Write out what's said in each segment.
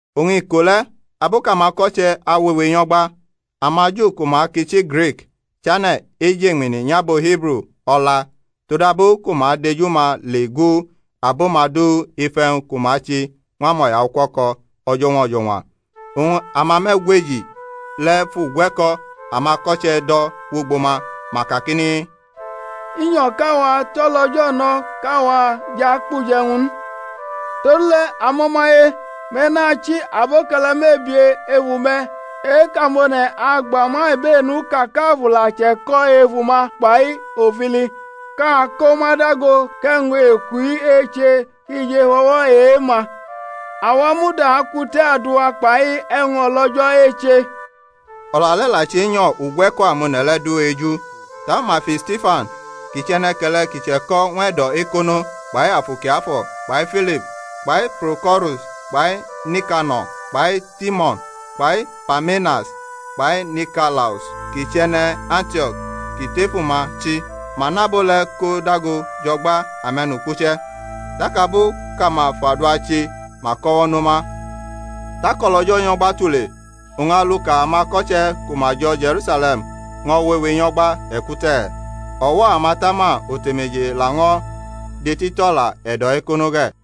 Oñ iko le̩, abu kʼamako̩che̩ awewe nyo̩gba, amaJu ku ma kʼichi Grik chane̩ ejeñmini nyʼabo Hibru o̩la todabu ku ma dʼeju-ma le gu abo-ma du ef e̩wñ ku ma che ñw amo̩yaukuo̩ko̩ o̩jo̩ñwa o̩jo̩ñwa. Oñ amame̩gweji le̩ fʼugwe̩ko̩ amako̩che̩ do̩ wʼugbo ma, ma kakini, I nyo̩ kʼawa tʼo̩lO̩jo̩ no̩ kʼawa jʼakpʼuje̩wñ n. Todule̩ amo̩maye, me̩ na chi aboke̩le̩ mebie efu-me̩ e-kʼamone̩ agba ma ibenu ka kʼAfu la che̩ko̩ efu-ma kpai ofili, kʼa ko ma dago kʼe̩wñ eku-i eche ki jʼef o̩wo̩ e-ma. Awa muda akute̩ adua kpai e̩wñ o̩lO̩jo̩ eche. O̩la le̩ la chenyo̩ ugwe̩ko amone̩ le̩ du eju. Taku ma fi Stifan ki chʼe̩ne̩ke̩le̩ ki che̩ko̩ ñw e̩do̩ ekono kpai Afu Kiafo̩ kpai Filip kpai Proko̩rus kpai Nikano̩r kpai Timo̩n kpai Parmenas kpai Nikalaus kʼi chʼe̩ne̩ Antio̩k ki tʼefu-ma chi. Ma mʼabo le̩ ko dago jʼo̩gba ame̩nukpuche̩. Tak abu kʼama fʼadua che ma kʼo̩wo̩ no ma. Tak o̩lO̩jo̩ nyʼo̩gba tule, oñ aluka amako̩che̩ ku ma jo̩ Je̩rusale̩m ño̩ wewe nyo̩gba e̩kute̩, o̩wo̩ amatama otemeje laño̩ detitʼo̩la e̩do̩ ekono ge̩.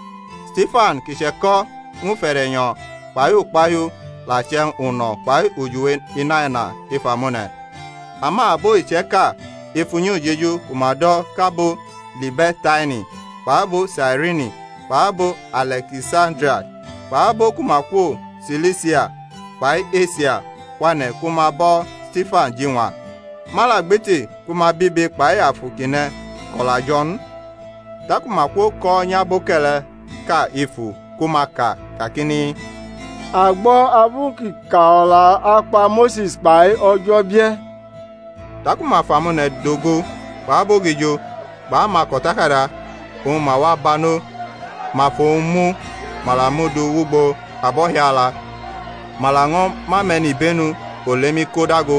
Stifan, ki che̩ko̩ ñw ufe̩de̩nyo̩ kpai ukpahiu, la chʼe̩wñ uno̩ kpai ujiwe inaina ef amone̩. Ama abo iche̩ka ef unyi ujeju ku ma do̩ kʼAbo Libe̩rta-ini kpʼabo Sairini kpʼabo Ale̩kisandria kpʼabo ku ma kwo Silisia kpai Esia kwane̩ ku ma bo̩ Stifan jiñwa. Ma la gbiti ku ma bʼibe kpai afu kʼi ne̩ ko̩la jo̩ n. Taku ma kwoko̩nyʼaboke̩le̩ʼka efu ku ma ka kakini, A gbo̩ abu kʼi ka o̩la akpa Mose̩s kpai O̩jo̩ bie̩. Taku ma fʼamone̩ dogo kpʼabogijo kpʼamako̩takada, oñ ma wa banʼo, ma fʼowñ mu ma la mʼu du wʼugbo abo̩hiala, ma laño̩ mʼame̩nibenu olemi ko dago.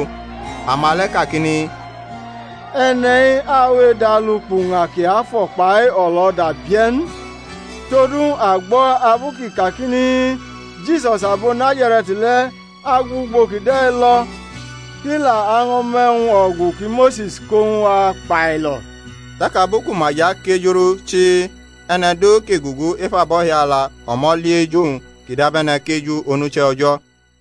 Ama le̩ kakini, E̩ne̩-i awe edʼalu kpʼuña kiafo̩ kpai o̩lo̩da bie̩ n: todu a gbo̩ abu kʼi kakini, Jisus abo Nazare̩t le̩ agu ugbo kide̩ lo̩, kʼi la año̩ mʼe̩wñ ogu ki Mose̩s ko ñw a kpailo̩. Tak abu ku ma jʼakejurʼu chii e̩ne̩ du ki gugu ef abo̩hiala o̩mo̩ li eju-wñ kʼi dabe̩ne̩ kʼeju onuche̩ O̩jo̩.